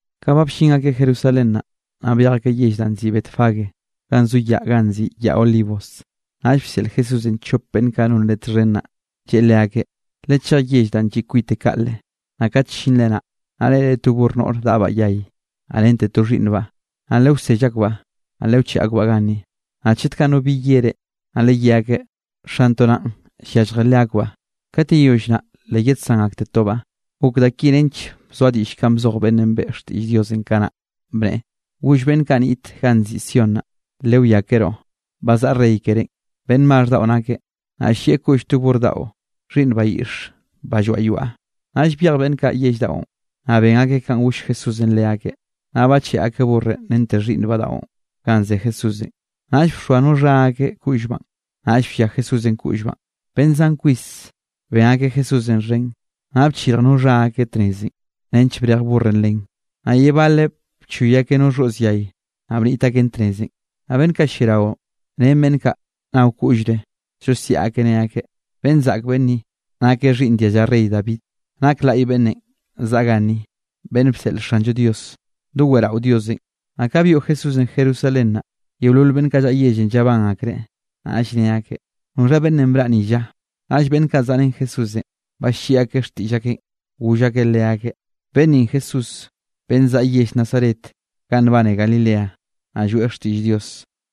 Ka ba ll-llin akeꞌ Jerusalén naꞌ, naꞌ byej akeꞌ yell danꞌ nziꞌi Betfagé, ganꞌ zo yaꞌ ganꞌ nziꞌi Yaꞌ Olivos. Naꞌll bseꞌl Jesúsenꞌ chop beꞌnn kaꞌ non Leꞌe txhen naꞌ, lleꞌe leakeꞌ: —Lechej yell danꞌ lliꞌ kwite kaꞌle, naꞌ kat llinre naꞌ, naꞌ reꞌre to burr noꞌre daꞌbaꞌ yay, naꞌ rente to xhiꞌnnbaꞌ. Naꞌ lewsell akbaꞌ, naꞌ lewcheꞌe akbaꞌ ganni. Naꞌ chet kaꞌ no bi ye reꞌ, naꞌ leyé akeꞌ: “Xantoꞌ naꞌn yalljreꞌ leakbaꞌ. Kat yeyoll naꞌ le yedsán aktetobaꞌ.” Gok da ki nench bzoa diꞌll kanꞌ bzoj beꞌnnenꞌ beꞌe xtiꞌll Dios kanaꞌ, bneꞌe: Goll beꞌnn kaꞌ niꞌt ganꞌ nziꞌi Sión naꞌ: “Lewiakeroꞌ, ba zaꞌa rey kerénꞌ, beꞌnn maxh daꞌo nakeꞌ, naꞌ llieꞌ koꞌll to burr daꞌo, xhiꞌnn bayiꞌx banꞌ lloaꞌ yoaꞌ.” Naꞌll byej beꞌnn kaꞌ yell daꞌon, naꞌ ben akeꞌ kanꞌ goll Jesúsenꞌ leakeꞌ. Naꞌll bacheꞌe akeꞌ burrenꞌ rente xhiꞌnnbaꞌ daꞌon ganꞌ ze Jesúsenꞌ, naꞌll bxoa no xha akeꞌ koꞌllbaꞌn, naꞌll bllia Jesúsenꞌ koꞌllbaꞌn. Beꞌnn zan kwis ben akeꞌ Jesúsenꞌ xhen, naꞌ bchirj no xha akeꞌ tnezenꞌ, nench brej burrenꞌ len, naꞌ ye baleꞌ bchoy akeꞌ no xhoꞌz yay, naꞌ bniꞌt akeꞌn tnezenꞌ. Naꞌ beꞌnn kaꞌ lliarao, ren beꞌnn kaꞌ nao koꞌllre, llosiaꞌ akeꞌ ne akeꞌ: —¡Beꞌnn zaꞌk beꞌnn ni, nakeꞌ xhiꞌnn dialla rey David! ¡Nak laꞌy beꞌnnenꞌ zaꞌa ganni, beꞌnn bseꞌl Xanllo Dios! ¡Doweꞌrao Diosenꞌ! Naꞌ ka byoꞌ Jesúsenꞌ Jerusalén naꞌ, yeolol beꞌnn kaꞌ llaꞌa yellenꞌ llabán akreꞌ, naꞌll ne akeꞌ: —¿Noxha beꞌnnenꞌ braꞌ ni lla? Naꞌll beꞌnn kaꞌ zaꞌrén Jesúsenꞌ, balliꞌi akeꞌ xtiꞌll akeꞌn, goll akeꞌ leakeꞌ: —Beꞌnn ninꞌ Jesús, beꞌnn zaꞌa yell Nazaret ganꞌ nbane Galilea, naꞌ lloeꞌ xtiꞌll Dios.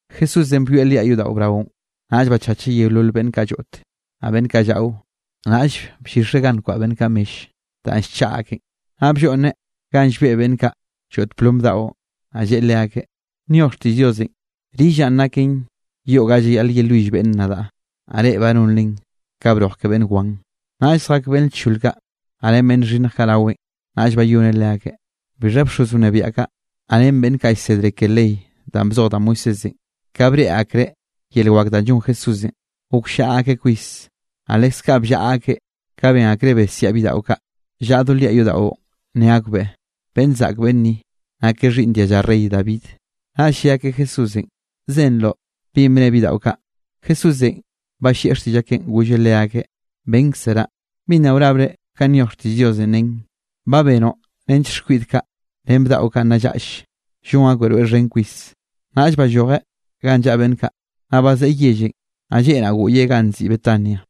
Jesúsenꞌ byoeꞌ liaꞌ yodaꞌo braonꞌ, naꞌll bachacheꞌ yeolol beꞌnn kaꞌ lloꞌt, naꞌ beꞌnn kaꞌ llaꞌo. Naꞌll bllixeꞌ ganꞌ nkwaꞌa beꞌnn kaꞌ mell danꞌ llchaꞌa akeꞌn, naꞌ blloꞌnneꞌ ganꞌ llbeꞌ beꞌnn kaꞌ lloꞌt plom daꞌo. Naꞌll lleꞌe leakeꞌ: —Nyoj xtiꞌll Diosenꞌ: “Rillaꞌn, naken yoꞌ ga llayaꞌl yelwill beꞌnn nadaꞌ”, naꞌ reꞌ ba nonren ka broj ke beꞌnn wan. Naꞌll zjak beꞌnn lchol kaꞌ, naꞌ ren beꞌnn xhinnj kaꞌ raweꞌn, naꞌll bayoneꞌ leakeꞌ. Bixha bxoz wnebiaꞌ kaꞌ, naꞌ ren beꞌnn kaꞌ llsedre ke ley danꞌ bzoj da Moisésenꞌ, ka breꞌe akreꞌ yel wak danꞌ llon Jesúsenꞌ, gokllaꞌa akeꞌ kwis, naꞌ leskaꞌ bllaꞌa akeꞌ ka ben akreꞌ besiaꞌ bidaꞌo kaꞌ llaꞌa do liaꞌ yodaꞌo ne akbeꞌ: “¡Beꞌnn zaꞌk beꞌnn ni, nakeꞌ xhiꞌnn dialla rey David!” Naꞌll lle akeꞌ Jesúsenꞌ: —¿Zenroꞌ binꞌ bne bidaꞌo kaꞌ? Jesúsenꞌ ballieꞌ xtiꞌll akeꞌn, golleꞌ leakeꞌ: —Bénkzeraꞌ. ¿Bi nna wrabre kanꞌ nyoj xtiꞌll Diosenꞌ? Nen: Ba benoꞌ nench xkwiꞌd kaꞌ, ren bdaꞌon nna llaꞌll, llon akbeꞌ rweꞌ xhen kwis. Naꞌll ballojeꞌ ganꞌ llaꞌa beꞌnn kaꞌ, naꞌ bazeꞌe yellenꞌ. Naꞌ lleꞌ naꞌ, goꞌyeꞌ ganꞌ nziꞌi Betania.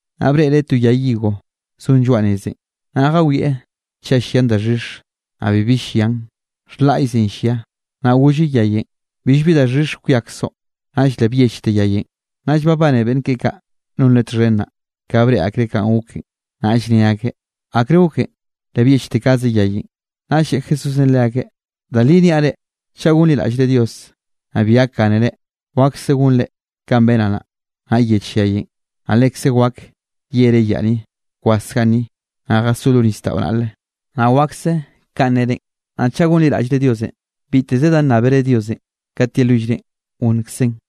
Naꞌ breꞌreꞌ to yay higo zon lloaꞌ nezenꞌ, naꞌ jawieꞌ chaꞌ llian daxhix. Naꞌ bibi llian, xhlaꞌyzenꞌ llia. Naꞌ golleꞌ yayenꞌ: —Billbi daxhix kwiakzoꞌ. Naꞌll le byechte yayenꞌ. Naꞌll babane beꞌnn keꞌe kaꞌ non Leꞌe txhen naꞌ, ka breꞌe akreꞌ kanꞌ goken, naꞌll ne akeꞌ: —¿Akre goken le byechte kaze yayenꞌ? Naꞌllenꞌ lle Jesúsenꞌ leakeꞌ: —Da li niaꞌ reꞌ, chaꞌ gonliraꞌllre Diosenꞌ, naꞌ bi gakgánere, wakse gonre kanꞌ benaꞌ naꞌ, naꞌ yech yayenꞌ, naꞌ lekze wak yere yaꞌ ni: “Kwas ganni, naꞌ jasó lo nisdaꞌo naꞌle”, naꞌ wakse kanꞌ nnerenꞌ. Naꞌ chaꞌ gonliraꞌllre Diosenꞌ, biteze da nnábere Diosenꞌ kat yelwillrenꞌ, gonnkzeꞌn.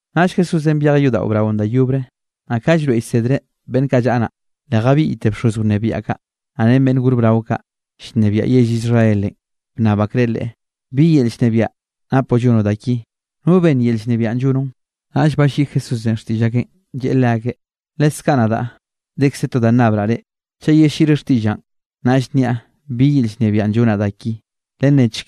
Naꞌll Jesúsenꞌ byejeꞌ yodaꞌo braonꞌ da yobre. Naꞌ ka llroeꞌ llsedreꞌ beꞌnn kaꞌ llaꞌa naꞌ, le jabiꞌyte bxoz wnebiaꞌ kaꞌ, naꞌ ren beꞌnn gor brao kaꞌ, llnebiaꞌ yell Israelenꞌ, bnnab akreꞌ Leꞌe: —¿Bi yel llnebiaꞌ napoꞌ llonoꞌ da ki? ¿No benn yel llnebiaꞌn llonoꞌn? Naꞌll balliꞌi Jesúsenꞌ xtiꞌll akeꞌn, lleꞌe leakeꞌ: —Leskaꞌ nadaꞌ dekze to da nnabraꞌ reꞌ. Chaꞌ yelliꞌre xtiꞌllaꞌn, naꞌll nniaꞌ bi yel llnebiaꞌn llonaꞌ da ki. Lennechk,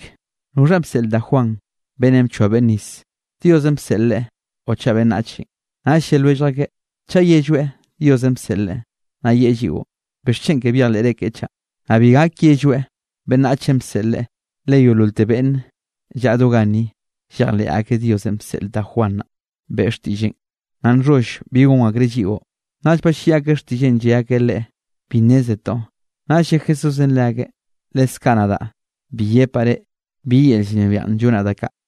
¿noxha bseꞌl da Juan beꞌnnenꞌ bchoa beꞌnne nis? ¿Diosenꞌ bseꞌl leꞌe, o chaꞌ beꞌnnachenꞌ? Naꞌll lle lwellj akeꞌ: —Chaꞌ yelloeꞌ Diosenꞌ bseꞌl leꞌe, naꞌ yeꞌe lliꞌo: “¿Bixchen ke byejleꞌre keꞌe chaꞌ?” Naꞌ bi gak yelloeꞌ beꞌnnachenꞌ bseꞌl leꞌe, le yeololte beꞌnne llaꞌa do ganni llejleꞌ akeꞌ Diosenꞌ bseꞌl da Juan naꞌ, beꞌe xtiꞌlleꞌn, naꞌ nxholl bi gon akreꞌ lliꞌo. Naꞌll balliꞌi akeꞌ xtiꞌlleꞌn lle akeꞌ Leꞌe: —Bi nnézetoꞌ. Naꞌll lle Jesúsenꞌ leakeꞌ: —Leskaꞌ nadaꞌ bi yepaꞌ reꞌ bi yel llnebiaꞌn llonaꞌ da kaꞌ.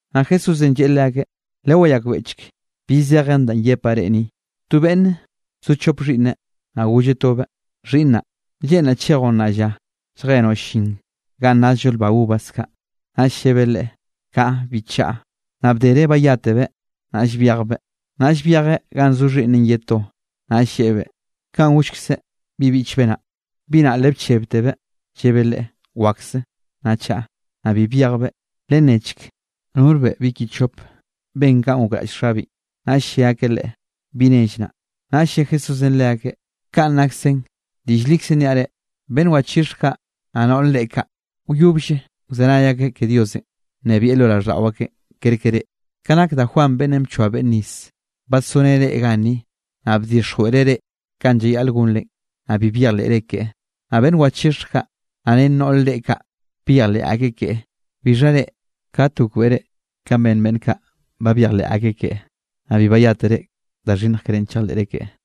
Naꞌ Jesúsenꞌ lleꞌe leakeꞌ: —Lewayakbeꞌchk bi zejen danꞌ yepaꞌ reꞌ ni: To beꞌnne bzo chop xhiꞌnneꞌ, naꞌ golleꞌ tobeꞌ: “Xhiꞌnnaꞌ, lleꞌnraꞌ chejoꞌ nnaꞌ lla, lljenoꞌ llin ganꞌ nazllo lba uvas kaꞌ.” Naꞌll llebeꞌ leꞌe: “Kaꞌa, bi chaꞌa.” Naꞌ bdere bayátebeꞌ, naꞌll byejbeꞌ. Naꞌll byejeꞌ ganꞌ zo xhiꞌnneꞌn ye to, naꞌll lleꞌebeꞌ kanꞌ gollkzeꞌ bi biꞌchbeꞌ naꞌ. Bi naꞌ le bchebtebeꞌ llebeꞌ leꞌe: “Wakse, naꞌ chaꞌa.” Naꞌ bi byejbeꞌ. Lennechk, ¿norbeꞌ bi ki chop ben kanꞌ gokraꞌll xabeꞌn? Naꞌll lle akeꞌ leꞌe: —Bi nell naꞌ. Naꞌll lle Jesúsenꞌ leakeꞌ: —Ka naksen. Diꞌll likze niaꞌ reꞌ, beꞌnn wachixhj kaꞌ, naꞌ noꞌr reꞌe kaꞌ, wyobll wzenay akeꞌ ke Diosenꞌ nnebieꞌ lo raꞌlldaꞌo akeꞌ kerke reꞌ. Ka nak da Juan beꞌnnenꞌ bchoa beꞌnne nis, badsoreneꞌ reꞌ ganni, naꞌ bdixjweꞌreꞌ reꞌ kanꞌ llayaꞌl gonre. Naꞌ bi byejleꞌre keꞌe. Naꞌ beꞌnn wachixhj kaꞌ, naꞌ ren noꞌre reꞌe kaꞌ byejleꞌ akeꞌ keꞌe. Bixha reꞌ, kate gokbeꞌre kanꞌ ben beꞌnn kaꞌ ba byejleꞌ akeꞌ keꞌe, naꞌ bi bayátere da xhinnj kerénꞌ chejleꞌre keꞌe.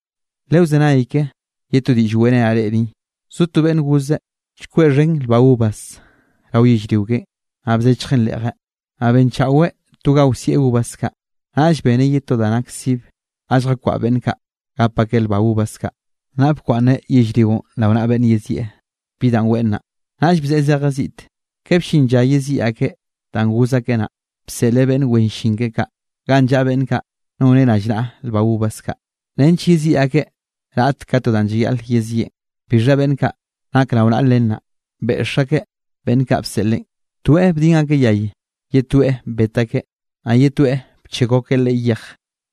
’Lewzenay ke ye to diꞌll weꞌrenaꞌ reꞌ ni. Bzo to beꞌnn gozeꞌ chkweꞌ xhen lba uvas rao yellrio keꞌen, naꞌ bzechjeꞌn reꞌje. Naꞌ benchaꞌweꞌ to ga wsieꞌ uvas kaꞌ. Naꞌll beneꞌ ye to da nak sibe ga lljakwaꞌa beꞌnn kaꞌ gap akeꞌ lba uvas kaꞌ. ’Naꞌ bkwaꞌnneꞌ yellrionꞌ rao naꞌa beꞌnn yezieꞌ bi danꞌ weꞌen naꞌ, naꞌll bzeꞌe zejeꞌ ziꞌte. Ka bllin lla yeziꞌi akeꞌ danꞌ goz akeꞌ naꞌ, bseꞌleꞌ beꞌnn wen llin keꞌe kaꞌ ganꞌ llaꞌa beꞌnn kaꞌ noneꞌ rallnaꞌa lba uvas kaꞌ, nench yeziꞌi akeꞌ raꞌt ka to danꞌ llayaꞌl yezieꞌn. Bixha beꞌnn kaꞌ nak rao naꞌa len naꞌ, beꞌx akeꞌ beꞌnn kaꞌ bseꞌleꞌn, toeꞌ bdin akeꞌ yay, ye toeꞌ bet akeꞌ, naꞌ ye toeꞌ bchekw akeꞌ leꞌe yej.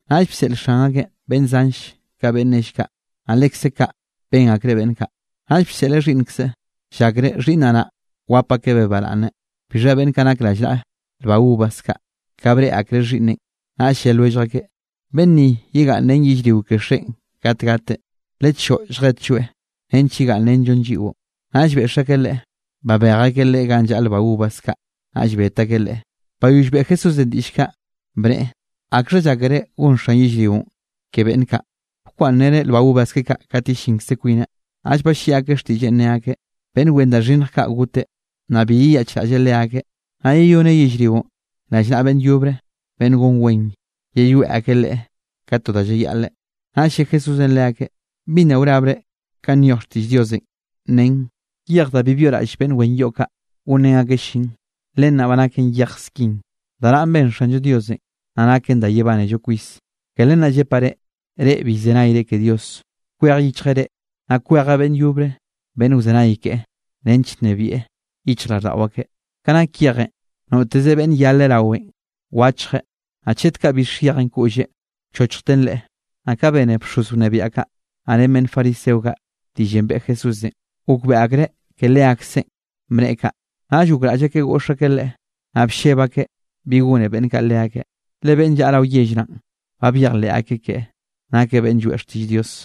Naꞌll bseꞌl xan akeꞌn beꞌnn zanll ka beꞌnn nell kaꞌ, naꞌ lekze kaꞌ ben akreꞌ beꞌnn kaꞌ. ’Naꞌll bseꞌleꞌ xhiꞌnnkzeꞌ, llakreꞌ xhiꞌnneꞌ naꞌ, wap akebeꞌ baraꞌnne. Bixha beꞌnn kaꞌ nak rallnaꞌa lba uvas kaꞌ, ka breꞌe akreꞌ xhiꞌnneꞌn, naꞌll lle lwellj akeꞌ: “Beꞌnn ni yegaꞌnn ren yellrio ke xeꞌen kat gateꞌ. Lechoꞌo lljetlloeꞌ nench yegaꞌnnrenllon lliꞌo.” Naꞌll beꞌx akeꞌ leꞌe, babej akeꞌ leꞌe ganꞌ llaꞌa lba uvas kaꞌ, naꞌll bet akeꞌ leꞌe. Bayoll beꞌe Jesúsenꞌ diꞌll kaꞌ, bneꞌe: —¿Akxha llákere gon xan yellrionꞌ ke beꞌnn kaꞌ, bkwaꞌnnreneꞌ lba uvas keꞌe kaꞌ kat yellinkze kwineꞌ? Naꞌll balliꞌi akeꞌ xtiꞌlleꞌn ne akeꞌ: —Beꞌnn wen da xhinnj kaꞌ goteꞌ, naꞌ bi yeyaꞌchraꞌlleꞌ leakeꞌ, naꞌ yeyoneꞌ yellrionꞌ rallnaꞌa beꞌnn yobre beꞌnn gon wen, yeyoeꞌ akeꞌ leꞌe ka to da llayaꞌleꞌ. Naꞌll lle Jesúsenꞌ leakeꞌ: —¿Bi nna wrabre kanꞌ nyoj xtiꞌll Diosenꞌ? Nen: Yej danꞌ bi byoꞌraꞌll beꞌnn wen yoꞌ kaꞌ, gonrén akeꞌ llin, len naꞌ ba naken yej skin. Da nanꞌ ben Xanllo Diosenꞌ, naꞌ naken da yebánello kwis. Ke len naꞌ llepaꞌ reꞌ, reꞌ bi llzenayre ke Dios, kwej yichjeꞌ reꞌ, naꞌ kwejeꞌ beꞌnn yobre beꞌnn wzenay keꞌe, nench nnebieꞌ yichjraꞌlldaꞌo akeꞌ. Ka nak yejenꞌ, noteze beꞌnn yaleꞌ rawen wachjeꞌ, naꞌ chet kaꞌ bix yejenꞌ koꞌlleꞌ, wchochjten leꞌe. Naꞌ ka bene bxoz wnebiaꞌ kaꞌ, naꞌ ren beꞌnn fariseo kaꞌ diꞌllenꞌ beꞌe Jesúsenꞌ, gokbeꞌe akreꞌ ke leakseꞌn bneꞌe kaꞌ. Naꞌll gokraꞌll akeꞌ goꞌx akeꞌ Leꞌe, naꞌ blleb akeꞌ bi gone beꞌnn kaꞌ leakeꞌ, le beꞌnn llaꞌa rao yell naꞌn, ba byejleꞌ akeꞌ keꞌe, nakeꞌ beꞌnn lloeꞌ xtiꞌll Dios.